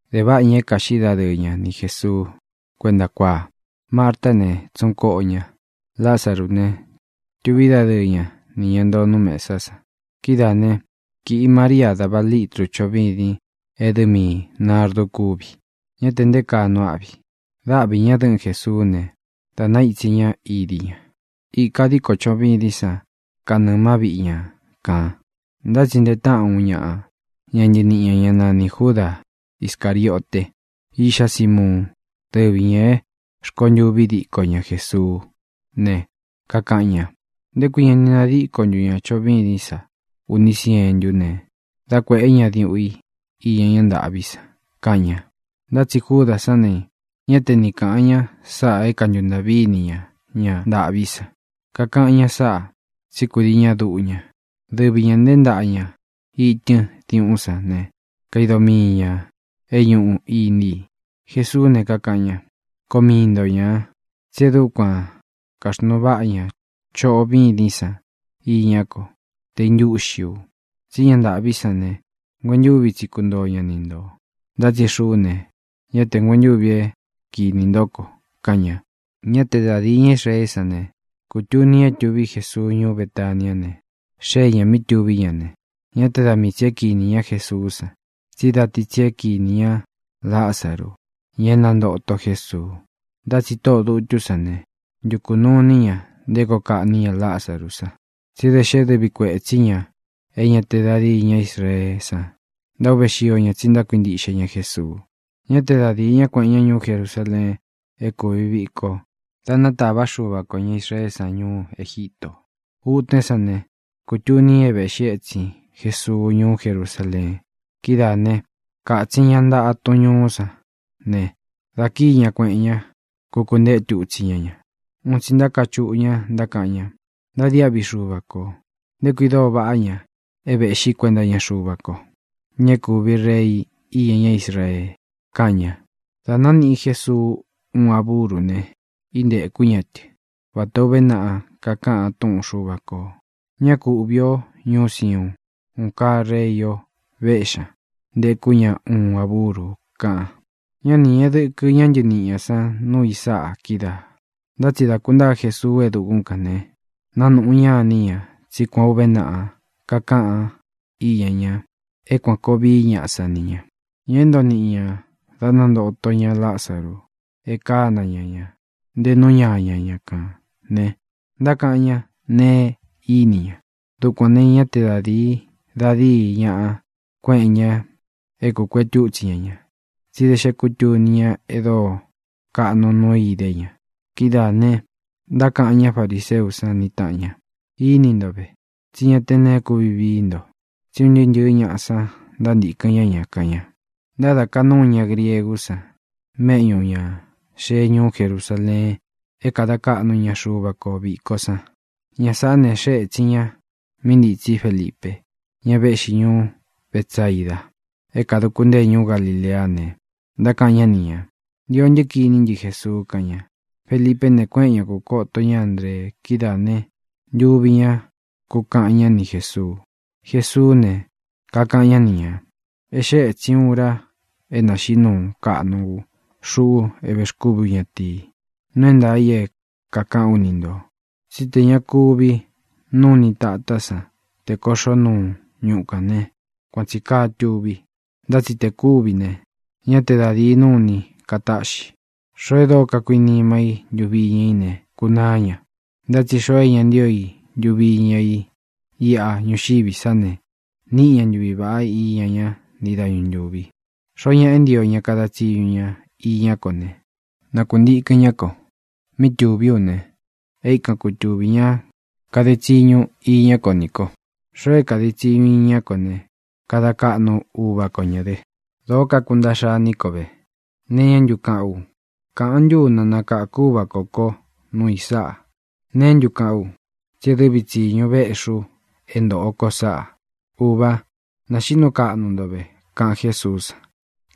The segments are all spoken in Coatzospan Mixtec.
Dēváꞌa ña é kāꞌxí dadɨɨ ña ni Jēsuu kuénta kuáa. Martá ne, tsūꞌun koꞌo ña. Lázaru ne, tuví dadɨɨ ña nī ña ntoo nú mesá san. Kidáā ne, kiꞌi María dāva lítru choꞌo vîdin e dɨ́ miī nardu kúvi. Ñá te nté kaa nuu áꞌvi. Dáꞌvi ña dɨ̄ꞌɨ́n Jesuú ne, dā naítsi ña idi ña. Īka díko choꞌo vîdín san kanɨɨ̄ má viꞌi ña kān. Ntá tsi ntee táꞌan uun ñaꞌa ña ntɨniꞌi ñā, ñá nanī Júda Iscāriote, iꞌxá Simuun, dɨ́vi ñā é rkontûvi diko ña Jésuú ne, kakaꞌan ña: —¿Nté kui ña ni nadíko ntu ña choꞌo vîdín sa uní sientú ne, dá kuēꞌé ña diuꞌun i iña ñá ntāꞌví san? —kaꞌan ña. Ntá tsi Júdā sán ne, ñá te ni kāꞌan ña sáꞌā é kantuntāꞌví ini ña ña ntāꞌví san. Kakaꞌan ña sáꞌa, tsí kūdii ñá duꞌu ña. Dɨvi ñā nteé ntaꞌa ña itɨ́n diuꞌún san ne, kaido miī ña é ñuꞌu iní i. Jesuú ne, kakaꞌan ña: —Koo mii nto ñā. Tsí e dúkuan kāxnuu váꞌa ña choꞌo vîdín san iñá ko te īntúꞌxi u. Tsí ña ntaꞌví san ne, nguentúvi tsi kuntoo ña ni ntō, ntá tsi xuꞌú ne, ñá te nguentúvi é kinī ntó ko —kaꞌan ña. Ñá te da dīi ñá Israeé san ne, kūtuni ña é tuví Jesuu ñuú Betaniá ne, xée ñā mí tuví ña, ne, ñá te da mii tsī é kinī ñá Jesuú san, tsí da ti tsi é kinī ña Lázaru, ña é nantōto Jésuu. Ntá tsi tóꞌō dutú san ne, ntukū nuu iní ña nté koo kaꞌní ña Lázaru san. Tsí da xé dɨvi kuetsí ña é ña te da díi ña Israeé san ntaúve xío ña tsi ntákuintiꞌxe ña Jesuu. Ñá te da dīi ñáꞌa kuéꞌen ña ñuú Jerusaleen é kūvi viko dá natāvá Xuva kō ña Israeé san ñuú Egítō. Utén san ne, kutuni ña é vēꞌxí etsin Jesuu ñuú Jerusaleen. Kidáā né, kātsin ña ntaꞌa tun ñuú san ne, dā kíi ña, kuēꞌen ña, kukuetú itsi ña ña. Un tsi ntákachuꞌu ña, ntákaꞌan ña: —¡Ntadiáꞌvi Xuva kō! ¡Nté kui dóo vaꞌá ña é vēꞌxí kuenta iña Xuva ko, ña é kūvi Rei iña ñá Israee! —kaꞌan ña. Dā nániꞌi Jesuu uun a búru ne, íntēkú ña tɨ, vatā ó uve naꞌa kakaꞌan túꞌun Xuva kō: Ñá ku uꞌvī o, ñúu Siuun. Un kaa Rei o, véꞌxi ña, ntekú ña uun a búru, kaꞌan. Ñá ni ñēꞌe dɨkɨ ñá ntɨniꞌi ñā san nuu i sáꞌa kídaā. Ntá tsi dā kuntáa Jesuu e dukún kān ne, nánūꞌu ñá iní ña tsí kuān o úve naꞌa kakaꞌan iña ña é kuān koo vií ñaꞌa san ni ña. Ña é ntoo niꞌi ñā da nantoto ña Lázaru e kána ña ña ntē nú ñaña ña kān ne, ntákaꞌan ñá neé ini ña. Dukuān ne, ñá te da dīi da díi ñáꞌa kueꞌen ña é kūkuetú itsi ña ña, tsí da xé kutuni ña e dóo kaꞌnu nuu i idé ña. Kidáā ne, ntákaꞌan ñá fariseú san ni tāꞌan ña: —Íni nto ve, tsí ña te neé kuvi vií nto. ¡Tsí un ntɨɨ́ ntɨ̄ɨ́ ñaꞌa san ntaíntīkɨn ñá ña! —kaꞌan ña. Ntádaka núu ña griegú san méꞌñū ña xee ñuú Jerusaleen é kada kaꞌnu ña Xuva kō viko san. Ña sāꞌá ne, xée ētsin ña mí ntitsí Felipe, ña véꞌxi ñuú Betsaida é kadūku ntée ñuú Galileá ne, ntákaꞌan ñá ni ñā: —Ntio ntɨ́ kiní ntɨ Jesuu —kaꞌan ña. Felipé ne, kuéꞌen ña kūkoto ñá Andree. Kidáā ne, ntuvi ñá kūkaꞌan ñá ni Jēsuu. Jesuú ne, kakaꞌan ñá ni ñā: —E xée ētsin ura é nāxiꞌí nuu kaꞌnu ú, xuꞌu é vēxkúvi ú ñatīi. Nuu é ntaā i é kākaꞌán u ni ntō tsí tē ña kuví nuni tatá san tē koꞌxó nuu ñuꞌu kān né, kuan tsī kaa tuvi. Ntá tsi te kūví ne, ñá te da dīi nuni katáꞌxi. Xoo e dóo kakuinima i ntuvi iña i ne, kunaá ña. Ntá tsi xoo é ña ntío i ntuvi iña i iꞌa ñuxiví sa ne, níꞌi ña ntuvi vāꞌá iña ña ntii dañu ntúvi. Xoó ñaꞌa é ntio ña kada tsiñu ña iñá ko ne, na kuntīkɨn ñá ko. Míꞌi tūví u ne, é ikan kutūví ña kade tsiñu iña kó nī ko. Xoo é kade tsiñu iña kó ne, kada kaꞌnu Uvā kó ña dɨ. ʼ¡Dóo kakuntaꞌxa iní ko ve! ¿Nee iñá ntu kaꞌán u? ¿Kāꞌan ntú u na nakākú Uvā kó ko nuu i sáꞌa? ¿Neé ntu kaꞌán u? Tsi é dɨvi tsīñu véꞌxi u é ntōꞌo ko sáꞌa. Ūva, naxiꞌí nuu kaꞌnu ntō ve —kaꞌan Jésuú san.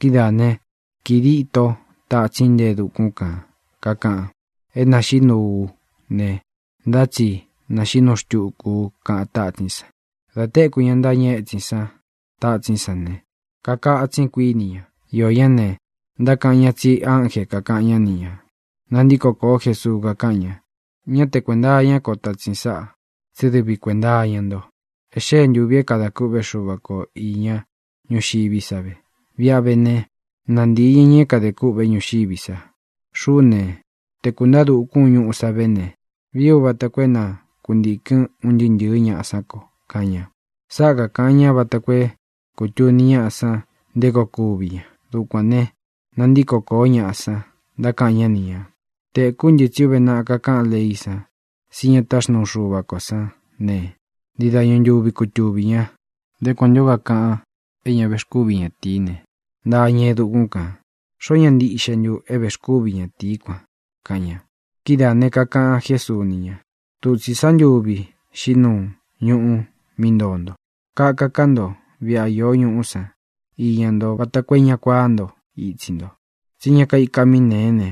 Kidáā né, kīi díto tatsín, nte e dukún kan kākaꞌan: —É nāxiꞌí nuu ú ne, ntá tsi nāxiꞌí nuu xtuku u —kaꞌan tatsín san. Dā téku ña ntáñɨ étsin sán tatsín san ne, kakatsin, kuiní ña. Iō ñá ne, ntákaꞌan ñá tsi ánje kākaꞌan ñá ni ñā. Nantíko kōó Jesuu, kakáꞌan ña: —Ñá te kuēnta iñá ko tatsin sáꞌa, tsí dɨvi kuēnta iña nto. E xée ntūvi é kadā kûꞌvé Xuva ko īña ñúxiví sa ve. Viꞌi a vé ne, nantīi ña ña é kadē kûꞌvé ñuxiví sa. Xuꞌú ne, te kūntaá dukún u ñuꞌu sá ve ne, vii ú vata koo é na kuntīkɨn un ntɨɨ́ ntɨ̄ɨ́ ñaꞌa sán ko —kaꞌan ña. Sáꞌa kakāꞌan ña vata koo é kūtuni ñáꞌa san nté koo kuví ña. Dukuān ne, nantíko koó ñaꞌa san, ntákaꞌan ñá ni ñā: —Tēkú ntɨ tsí uve naꞌa kakáꞌan leí san tsí ña táxnuu Xuva kō sán ne, ntii dañu ntuvi kutuvī ña. ¿Nté kuan ntū ó kakaꞌan é ña vexkúvi ñatīí ne, ntaa ña e dukún kān? ¿Xoó ñaꞌa ntiꞌxe ntu é vēxkúvi ñatīí kuan? —kaꞌan ña. Kidáā ne, kakaꞌan Jésuu ni ña: —Dutsī sá ntuvi xiꞌí nuu ñuꞌu mí ntoo nto. Kaka ká nto viꞌi a iō ñuꞌú san iña nto vata koo é ña kuaá nto itsi nto. Tsí ña kaika mí nēé ne,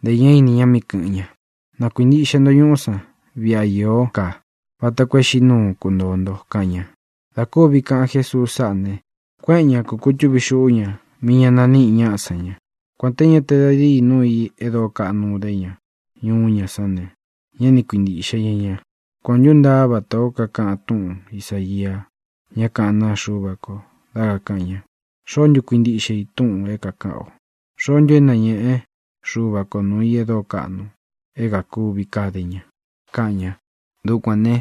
ntē ñá ini ña mí kɨ̄ꞌɨn ña. Na kuīntiꞌxe nto ñuꞌú san viꞌi a īó ka vata koo e xiꞌí nuu kuntōo nto —kaꞌan ña. Dā kúvi kaꞌan Jésuu sáꞌa ne, kuéꞌen ña kūkutúvi xuꞌu ña mí ñā naníꞌi ñáꞌa san ña. Kuān te ña te da díi núu i e dóo kaꞌnu idé ña nuu ñaꞌá san ne, ñá ni kuintīꞌxe ña ña. Kuān o ntúntaa vatā ó kakaꞌan túꞌun Isāia, ñá kaꞌán naa Xuva ko, dá kakāꞌan ña: ¿Xoó ntu kuíntiꞌxe i túꞌūn é kākaꞌán o? ¿Xoó ntu é nañéꞌe Xuva kō nuu i e dóo kaꞌnu é kākuvi kade ña? kaꞌan ña. Dukuān ne,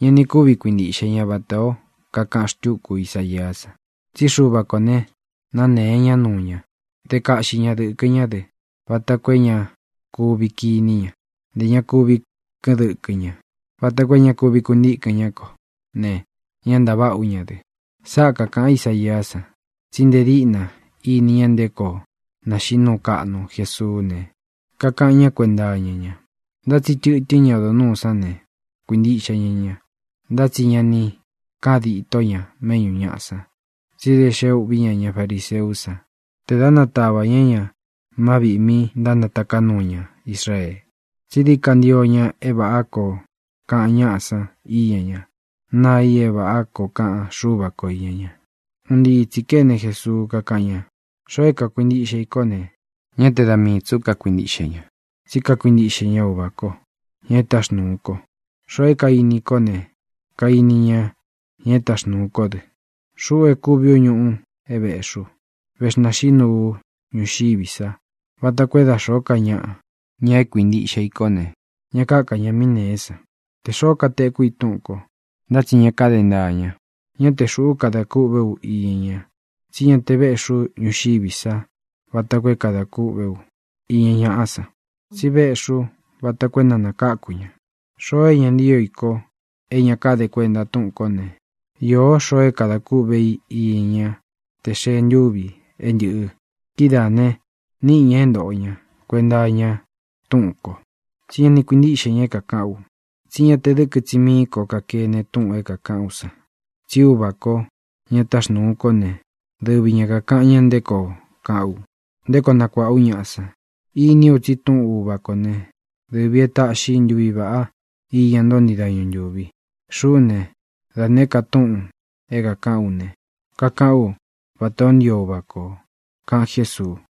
ña ni kúvi kuintīꞌxe ña, vatā ó kakaꞌan xtúku Isaiá san: Tsí Xuva kō ne, nanée ñá nuu ña. Dé kaꞌxi ña dɨ̄kɨ ñá dɨ vata koo é ña kuvi kiní ña, ntē ña kuvi kɨ́ꞌɨn dɨkɨ ñá, vata koo é ña kuvi kuntíkɨn ñá ko ne, ñá ntaváꞌa ú ña dɨ. Sáꞌa kākaꞌan Isaiá san, tsí nte díꞌna íni ña nté koo naxiꞌí nuu kaꞌnu Jesuú ne, kakaꞌan ñá kuenta iña ña. Ntá tsi tɨtɨ́n ña odo nūú san ne, kuīntiꞌxe ña ña. Ntá tsi ña ni káꞌān ditó ña méꞌñū ñaꞌa san, tsí da xé ūꞌví ña ña fariseú san tē da natava ña ña má viꞌī mí ntánataká nuu ña Israee. Tsí dií ka ntio ña é vāꞌá koo kaꞌan ñáꞌa san iña ñá, naa i é vāꞌá koo kaꞌan Xúva ko īña ña. Un ntii tsī kéne Jesuu, kakáꞌan ña: —Xoo é kākuintiꞌxe i kó ne, ñá te da mii tsī ú kakuintiꞌxe ña, tsí kakuintiꞌxe ña Uvā kó, ña e táxnūu ko. Xoo é kainí i kó ne, kainí ña ña e táxnūu kó dɨ. Xuꞌú e kúvi ú ñuꞌu é vēꞌxí u, vexnaxiꞌí nuu u ñuxiví sa vata koo é da xōó ka ñaꞌa, ña é kuintiꞌxe i kó ne, ña káka ña mí nēé san. Tē xoó kateku i túꞌūn ko, ntá tsi ña káde ntaa ña, ñá te xūꞌú kadā kûꞌvé u iña ña. Tsi ñá te vēꞌxí u ñuxiví sa vata koo é kadā kûꞌvé u iña ñáꞌa san, tsi véꞌxī ú vata koo é na nākáku ña. Xoo é ña ntío i ko, é ña káde kuenta túꞌūn kó ne, īó xoo é kadā kúꞌvē í iña ñá tē xee ntúvi é ntɨ̄ꞌɨ. Kidáā ne, niꞌi ña é ntoꞌo ña kuenta iña túꞌūn ko, tsí ña ni kuintíꞌxe ña é kākaꞌán u. Tsí ña te dɨ̄kɨ tsi mií ko kakene túꞌūn é kākaꞌán u san. Tsí Uvā kó, ña táxnūu kó ne, dɨvi ña kākaꞌan ña nté koo kaꞌán u, nté koo nakuāꞌa ú ñaꞌa san. Iní u tsi túꞌun Uvā kó ne, dɨvī é taꞌxi ntuvi vāꞌá iña nto ntii dañu ntūvi. Xuꞌú ne, da nēé ka túꞌūn é kākaꞌán u ne, kakaꞌán u vatā ó ntio Uvā ko —kaꞌan Jésuu.